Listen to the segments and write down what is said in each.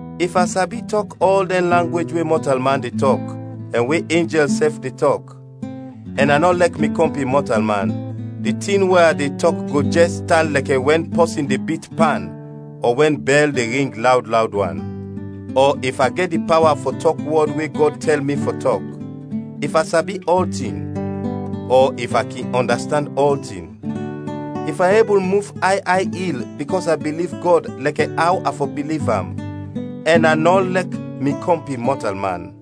If a sabi tɔk ɔl dɛn langwej we mɔtalman de tɔk ɛn we enjɛl sɛf de tɔk, ɛn a nɔ lɛk mi kɔmpin mɔtalman, di tin we a de tɔk go jɛs tan lɛkɛ wɛn pɔsin de bit pan ɔ wɛn bɛl de ring lawd lawd wan. Ɔ if a gɛt di pawa fɔ tɔk wɔd we Gɔd tɛl mi fɔ tɔk; if a sabi ɔltin; ɔ if a kin ɔndastand ɔltin; if a ebul muf ay ay il bikɔs a biliv Gɔd lɛkɛ aw a fɔ biliv am, ɛn a nɔ lɛk mi kɔmpin mɔtalman,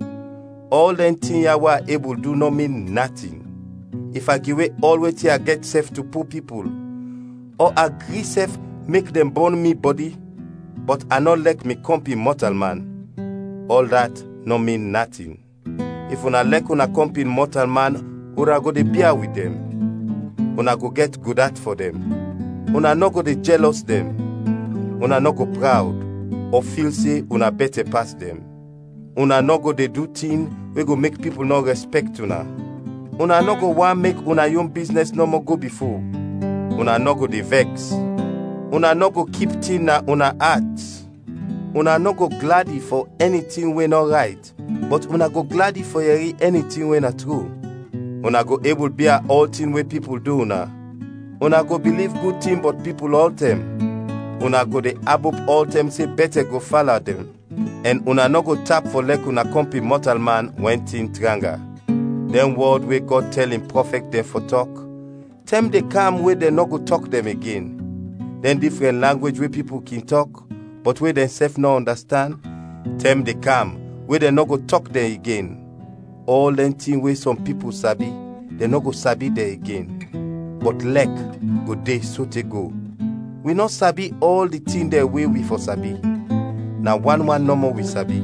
ɔl dɛn tin ya we a ebul du nɔ min natin. If a giwe ɔl wetin a gɛt sɛf to po pipul, ɔ a gri sɛf mek dɛn bɔn mi bɔdi, bɔt a nɔ lɛk mi kɔmpin mɔtalman, ɔl dat nɔ min natin. If una lɛk una kɔmpin mɔtalman una go de bia wit dɛn; una go gɛt gud at fɔ dɛn; una nɔ go de jɛlɔs dɛn; una nɔ go prawd; ɔ fil se una bɛtɛ pas dɛn. Una nɔ go de du tin we go mek pipul nɔ rɛspɛkt una; una nɔ go want mek una yon biznɛs nɔmɔ go bifo; una nɔ go de vɛks; una nɔ go kip tin na una at; una nɔ go gladi fɔ ɛni tin we nɔ rayt, bɔt una go gladi fɔ yɛri ɛni tin we na tru. Una go ebul bia ɔltin we pipul du una; una go biliv gud tin bɔt pipul ɔltɛm; una go de abop ɔltɛm se bɛtɛ go fala dɛn; ɛn una nɔ go tap fɔ lɛk una kɔmpin mɔtalman wɛn tin tranga. Dɛn wɔd we Gɔd tɛl in prɔfɛt dɛn fɔ tɔk, tɛm de kam we dɛn nɔ go tɔk dɛn igen; dɛn difrɛn langwej we pipul kin tɔk, bɔt we dɛnsɛf nɔ ɔndastand, tɛm de kam we dɛn nɔ go tɔk dɛn igen; ɔl dɛn tin we sɔm pipul sabi, dɛn nɔ go sabi dɛn igen. Bɔt lɛk go de sote go. Wi nɔ sabi ɔl di tin dɛn we wi fɔ sabi, na wan wan nɔmɔ wi sabi;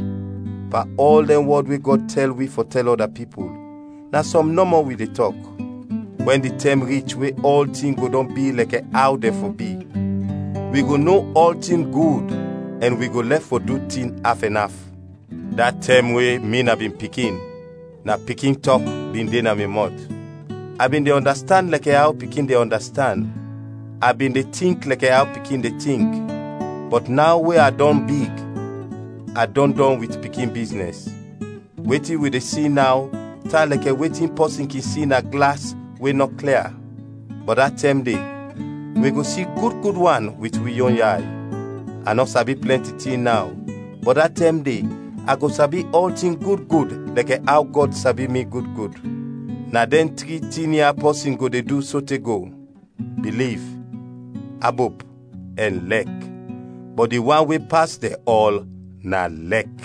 pan ɔl dɛn wɔd we Gɔd tɛl wi fɔ tɛl ɔda pipul, na sɔm nɔmɔ wi de tɔk. Wɛn di tɛm rich we ɔltin go dɔn bi lɛkɛ aw dɛn fɔ bi, wi go no ɔltin gud ɛn wi go lɛf fɔ du tin af ɛn af. Da tɛm we mi na bin pikin, na pikin tɔk bin de na mi mɔt, a bin de ɔndastand lɛkɛ aw pikin de ɔndastand, a bin de tink lɛkɛ aw pikin de tink; bɔt naw we a dɔn big a dɔn dɔn wit pikin biznɛs. Wetin wi de si naw tan lɛkɛ wetin pɔsin kin si na glas we nɔ klia; bɔt da tɛm de, wi go si gud gud wan wit wi yon yay. A nɔ sabi plɛnti tin naw, bɔt da tɛm de a go sabi ɔltin gud gud lɛkɛ aw Gɔd sabi mi gud gud. Na dɛn tri tin ya pɔsin go de du sote go: biliv, abop, ɛn lɛk, bɔt di wan we pas dɛn ɔl na lɛk.